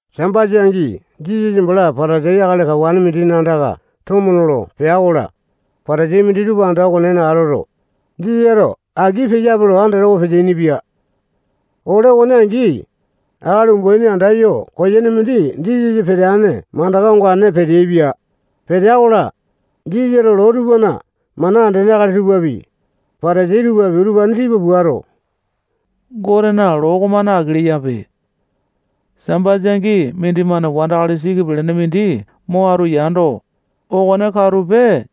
Sambasa angi Jisasa bala Patasai akali kawane mindina andaka tomo nolo pea-kola, Patasai minditupa anda okonena atoto, Jisasato aki peyape lo andatawa peteaini-pia. Ole okone angi, akali umbaini andayo koyene mindi Jisasa peteane mandaka ongane peteaipia. Petea-kola, Jisasato loo tupana mana andene akali tupapi, Patasai tupapi, utupane tipa puato, Gotena loo okomane aki leyape. Sambasa angi mindimane wandakali siki pelene mindi mo atu yando, okone katupe,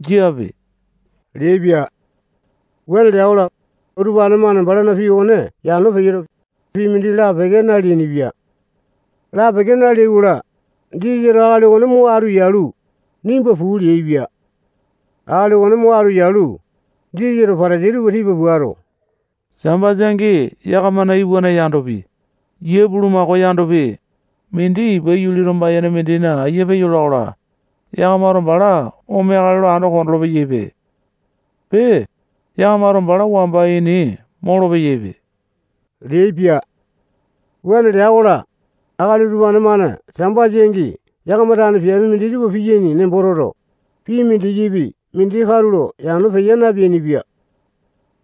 jiape leaipia. Wuane lea-kola, utupane-mane balana pii okone yano peyoto, pii mindi lapeke naleainipia. Lapeke naleai-kola, Jisasato akali okone mo atu yalu, nimba puu leaipia. Akali okone mo atu yalu, Jisasato Patasai tupa tipa puato, Sambasa angi yakamana iwanane yandopi, yia bulamakao yandopi, mindi ipa yuli tomba-yene mindina ayia peyola-kola, yakamato bala omeakale lo ando kondolo-peyaipe. Pee, yakamato bala wamba ini molo-peyaipe leaipia. Wuane lea-kola, akali utupane-mane Sambasa angi yakama tane piape minditupa piyaini nembo toto, pii mindikipi mindi katulo yano peya napeainipia.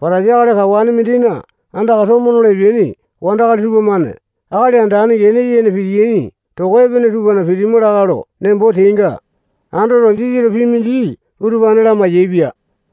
Patasai akali kawane mindina andaka nolo epeaini wandakali tupamane akali andane gene yene pitiyaini toko epene tupana pitima lakae lo nembo teainga andoto, Jisasato pii mindi utupane lamai-yaepia.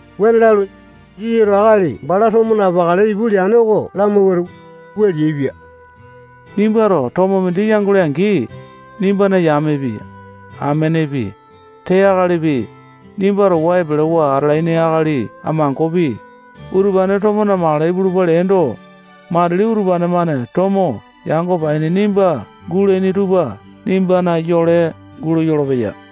Wuane lalu, Jisasato akali bala tomo namakale ipu leane oko lamawuato, wua leaipia: Nimbato tomo mindi yangole-angi, nimbana yamepi, amenepi, tee akalipi, nimba towa epelewa atalaini akali amangopi, utupane tomo namakale ipulupa leendo, matili utupane-mane tomo yango paini nimba gulaini tupa nimbana yole gulo yolopeya.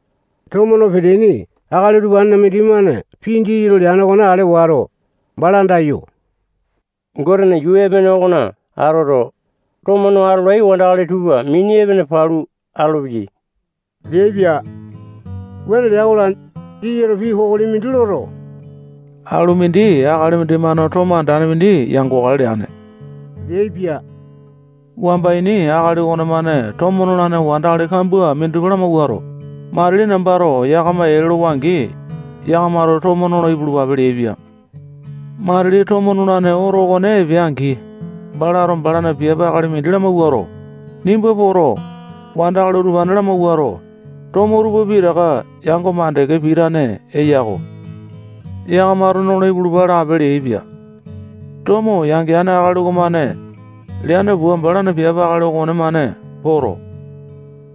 Tomo no peteaini akali utupanena mindimane pii Jisasato leane okone ale wato, bala andayo, Gotena yuu epene okona atoto, tomo no atolai wandakali tupa mini epene palu atolopeyai leaipia. Wuane lea-kola, Jisasato pii kokoli mindi loto, alumindi akali mindimane tomo andane mindi yangokale leane leaipia. Wamba ini akali okonemane tomo nolane wandakali kambua minditupa lamawuato, matili nambato yakama ee lolowa-angi, yakamato tomo nolo ipulupape leaipia. Matili tomo nolane oto okone epea-angi, balato balana piape akali mindi lamawuato, nimba poto, wandakali utupane lamawuato, tomo tupa pitaka yango mandeke pitane eya-ko. Yakamato nolo ipulupa lape leaipia. Tomo yangeane akali okomane leane pua, balana piape akali okonemane poto,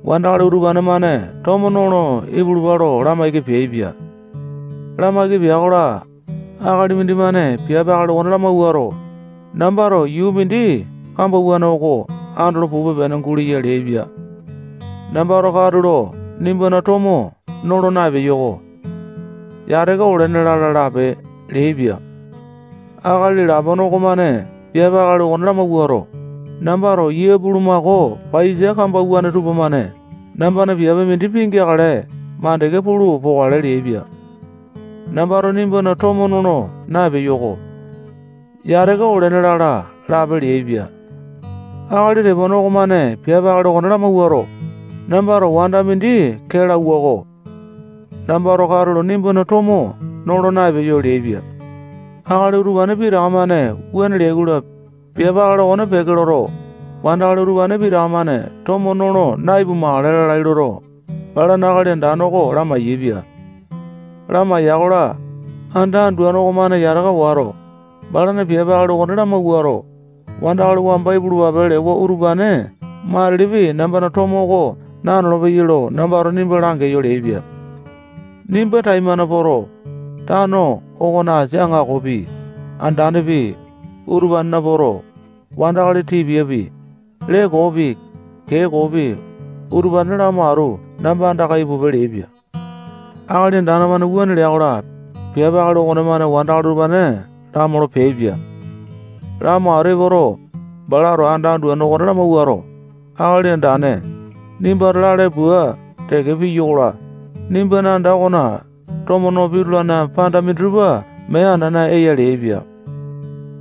wandakali utupane-mane tomo nolo ipulupa lo lamaiki peaipia. Lamaiki pea-kola, akali mindimane piape akali okone lamawuato, nambato yuu mindi kambauwane oko andolo pupe-pene guleya leaipia. Nambato katulo nimbana tomo nolo na-epeyoko. Yataka olene lala lape leaipia. Akali lapone okomane piape akali okone lamawuato, nambato yia bulumako paiyasa kambauwane tupamane nambana piape mindi pingeakale mandeke pulu pokale leaipia. Nambato nimbana tomo nolo na-epeyoko. Yataka olene lala lape leaipia. Akali tepone okomane piape akali okone lamawuato, nambato wanda mindi kee lauwa-ko. Nambato katulo nimbana tomo nolo naepeyo leaipia. Akali utupane pitaka-mane wuane leai-kola, piape akali okone peke loto, wandakali utupane pitaka-mane tomo nolo na-ipumakale lalai loto, balana akali andane oko lamai-yaepia. Lamaiya-kola, anda anduane okomane yataka wato, balana piape akali okone lamawuato, wandakali wamba ipulupape lewa utupane matilipi nambana tomo oko nanolo-peyai lo nambato nimba langeyo leaipia. Nimba taimane poto, tano okona asini aŋakopi, andanepi, utupanena poto, wandakali tipiapi, lee koopi, kee koopi, utupane lamo atu namba andaka ipupe leaipia. Akali Andane okomane wuane lea-kola, piape akali okonemane wandakali utupane lamolo peaipia. Lamo atu epoto, balato anda anduane okone lamawuato, Akali Andane, nimbato lale pua teke piyo-kola, nimbana anda okona tomo no pitulane panda minditupa mee anana eya leaipia.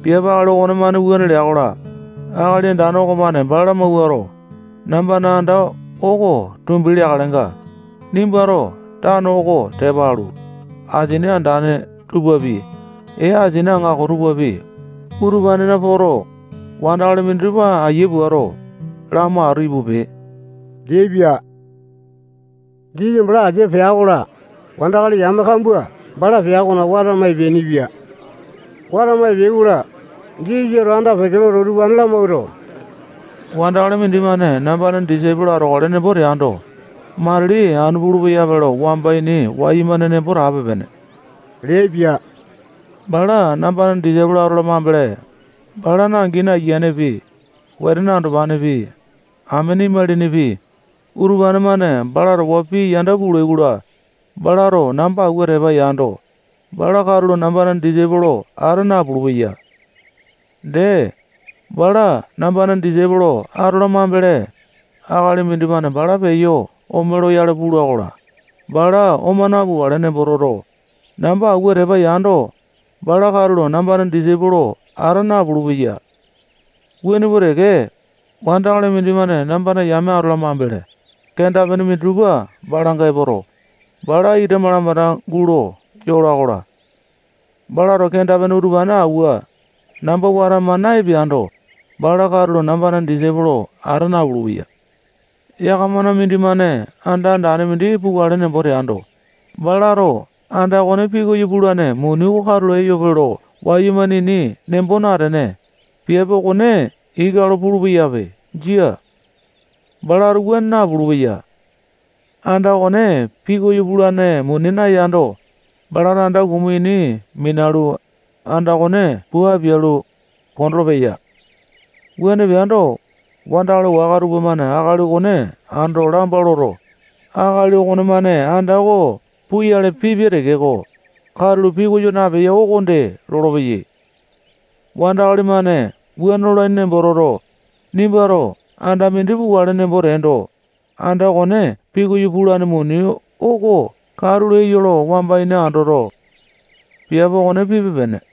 Piape akali okonemane wuane lea-kola, akali andane okomane bala lamawuato, nambana anda oko tumbi leakalenga, nimbato tano oko tepa alu, asini andane tupapi, ee asini aŋako tupapi, utupanena poto, wandakali minditupa ayia puato, lamo atu ipupe leaipia. Jisasa bala asia pea-kola, wandakali yame kambua bala pea okona watama epeainipia. Watama epeai-kola, Jisasato anda-peke loto, utupane lamawuato, wandakali mindimane nambana disaipolo atokale nembo teando, matili anu pulu-peyape lo wamba ini wayumane nembo tape-pene leaipia. Bala nambana disaipolo atola mambele, balana angini ayianepi, wetene andopanepi, amene imalinipi, utupane-mane bala towa pii yanda pulai-kola, balato namba awua tepa yando, bala katulo nambana disaipolo ata napulu-peya. Dee, bala nambana disaipolo atola mambele, akali mindimane bala peyo ome loyale pula-kola, bala oma napukale nembo toto, namba awua tepa yando, bala katulo nambana disaipolo ata napulu-peya. Wuane pua teke, wandakali mindimane nambana yame atola mambele, kenda-pene minditupa balanga epoto, balana ita malamanda gulo yola-kola, balato kenda-pene utupane awua, namba watama na-epeando, bala katulo nambana disaipolo ata napulu-peya. Yakamana mindimane anda andane mindi pukale nembo teando, balato anda okone pikoyo pulane muni oko katulo eyope lo wayumane ini nembo natene, piape okone ika lo pulu-peyape. Jia. Balato wuane napulu-peya. Anda okone pikoyo pulane muni nayando, balato anda kumu ini minalu, anda okone pua apialu, kondolo-peya. Wuane peando, wandakali waka tupamane akali okone ando lamba loto, akali okonemane anda oko puyale pipia tekeko, katulo pikoyo napeya okonde lolopeyai. Wandakali-mane wuane lolaini nembo toto, nimbato anda mindi pukale nembo teendo, anda okone pikoyo pulane muni oko katulo eya lo wamba ini andoto, piape okone pipe-pene.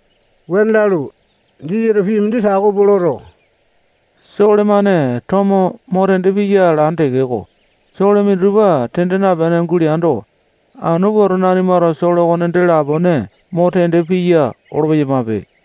Wuane lalu, Jisasato pii mindi tako pua loto, sole-mane tomo mo tende piya alane tekeko, sole minditupa tende napene guleando, anu pua, nanimato sole okone dee lapone mo tende piya olo-peyamape.